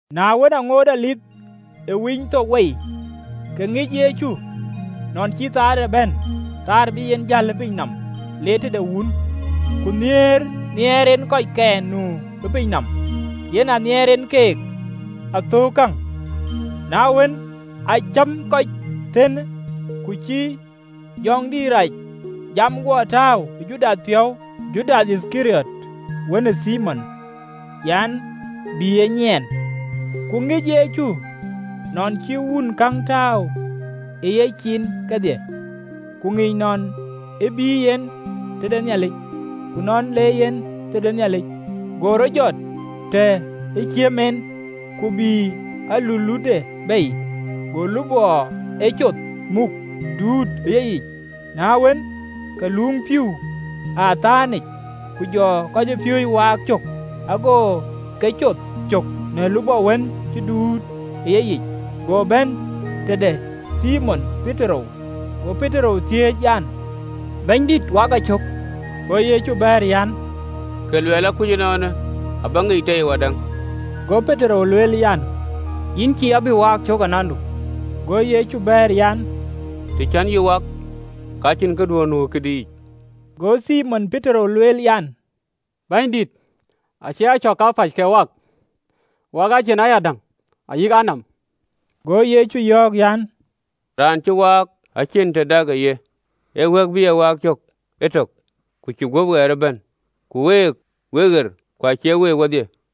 Na wën, aŋoot Dhuëëŋ ë Winythok wei, ke ŋic Yecu nɔn cï köölde bɛ̈n, kööl bï en jäl piny le tëde Wun, ku nhiëër nhiɛɛr en kɔckɛn nu ë piny nɔm, yen aa nhiɛɛr en keek athöökë käŋ. Na wën, aa cäm kɔc thëën, ku jɔ jɔŋdït rac jam guɔ tääu ë Judath piɔ̈u, Judath Yithkariɔt wën ë Thimon an, bï e nyiɛɛn. Ku ŋic Yecu nɔn cï Wun käŋ tääu ë yecin kedhie, ku ŋic nɔn ë bïï yen tëde Nhialic, ku nɔn le yen tëde Nhialic. Go rɔt jɔt të ë ciëm en, ku bïï alulutde bei, go lupɔ ee coth muk, duut ë yeyic. Na wën, ke luuŋ pïïu ë abïny yic, ku jɔ kɔcpiööcë waak cök, ago ke coth cök në lupɔ wën cï duööt ë yeyic. Go bɛ̈n tëde Thimon Petero, go Petero thiëëc an, “Bɛ̈nydït, wak a cök?” Go Yecu bɛ̈ɛ̈r an, “Kë luɔɔi akuc ënɔɔnë, abä ŋic tei wadäŋ.” Go Petero lueel an, “Yïn cïï abï waak cök anandu!” Go Yecu bɛ̈ɛ̈r an, “Të cän yïn wak, ka cïn këduön nu ë këdï yic.” Go Thimon Petero lueel an, “Bɛ̈nydït, acie a cök kapäc kek wak, wak a cin ayadäŋ ayïk a nɔm!” Go Yecu yɔ̈ɔ̈k an, “Raan cä waak, acïn tëdak ë ye, ee wɛ̈k bï e waak cök etök, ku cï guöp ɣɛɛr ëbɛ̈n: ku week, wek ɣer, ku acie week wedhie.”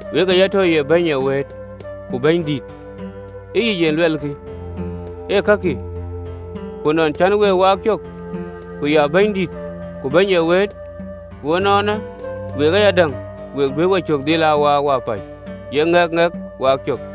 “Wek ee ya tɔ ye Bɛ̈ny ee wëët, ku Bɛ̈nydït, ee yic en luɛlkï, ee kakï. Ku ënɔn cän week waak cök, ku ya Bɛ̈nydït ku bɛ̈ny ee wëët, ku ënɔɔnë, week ayadäŋ we duëër wecök dhil waak wapäc, ye ŋɛk ŋɛk waak cök.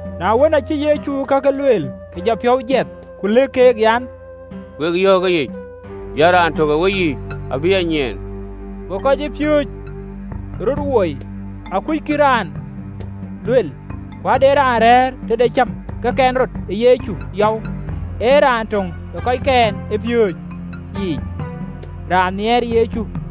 Na wën, acï Yecu kakë lueel, ke jɔ piɔ̈u jiɛth, ku lëk keek an, “Wek yɔ̈ɔ̈k ëyic an: Raan tök ë week abï a nyiɛɛn.” Go kɔcpiööcë röt woi, akuckï raan lueel. Ku ade raan rɛ̈ɛ̈r tëde cäm ke kɛn rɔt ë Yecu yɔu, ee raan töŋ ë kɔckɛn ë piööcë yiic, raan nhiɛɛr Yecu.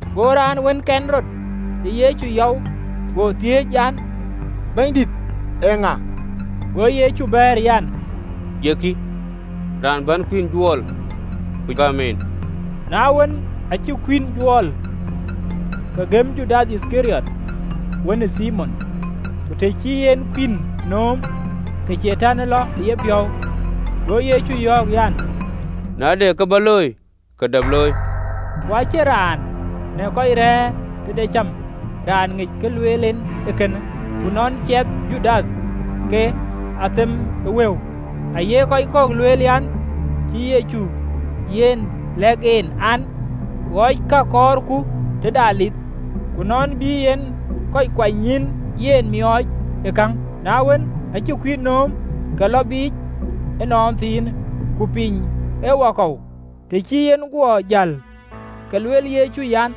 Go raan wën kɛn rɔt ë Yecu yɔu go thiëëc an, “Bɛ̈nydït eeŋa?” Go Yecu bɛ̈ɛ̈r an, “Ye kï, raan bän kuïn juɔɔl, ku gäm en.” Na wën, aacï kuïn juɔɔl, ke gëm Judath Yithkariɔt, wën ë Thimon. Ku të cï en kuïn nööm, ke Catan lɔ ë yepiɔ̈u. Go Yecu yɔ̈ɔ̈k an, “Na de kë bä looi, ke dap looi!” Ku acïn raan në kɔc rɛ̈ɛ̈r tëde cäm raan ŋic kë lueel en ee kënë. Ku në luɔi ciɛthë Judath ke athep ë wëu, aye kɔc kɔ̈k lueel an, cï Yecu yiɛ̈n lɛ̈k en an, ɣɔc ka kɔɔrku tëde Dhuëëŋ, ku nɔn bï en kɔc kuanynyïïn yiɛ̈n miɔɔc ë käŋ. Na wën, aacï kuïn nööm, ke lɔ biic ënɔnthiinë: ku piny ee wakɔ̈u. Të cï en guɔ jäl, ke lueel Yecu an,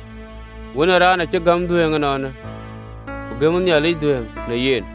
“Wën ë Raan acï gäm dhuëëŋ ënɔɔnë, ku gëmë Nhialic dhuëëŋ në yen.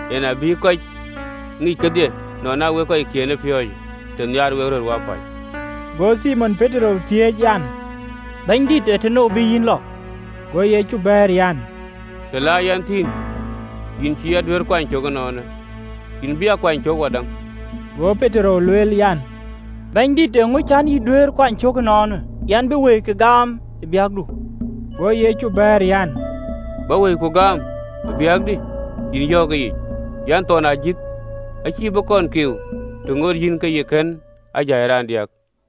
Yen abï kɔc e ŋic kedhie nɔn aa wek kɔckiën ë piööcë, të nhiaar wek röt wapäc.” Go Thimon Petero thiëëc an, “Bɛ̈nydït, ee tënou bï yïn lɔ?” Go Yecu bɛ̈ɛ̈r an, “Të la yɛn thïn, yïn cïï a duëër kuany cök ënɔɔnë, yïn bï a kuany cök wadäŋ.” Go Petero lueel an, “Bɛ̈nydït, eeŋö cän yï duëër kuany cök ënɔɔnë? Yɛn bï wëikï gaam ë biäkdu!” Go Yecu bɛ̈ɛ̈r an, “Bä wëiku gaam ë biäkdï? Yïn yɔ̈ɔ̈k ëyic an, thɔn ajïth acïï bï kɔn kiu, të ŋoot yïn ke yï kën a jai raandiäk.”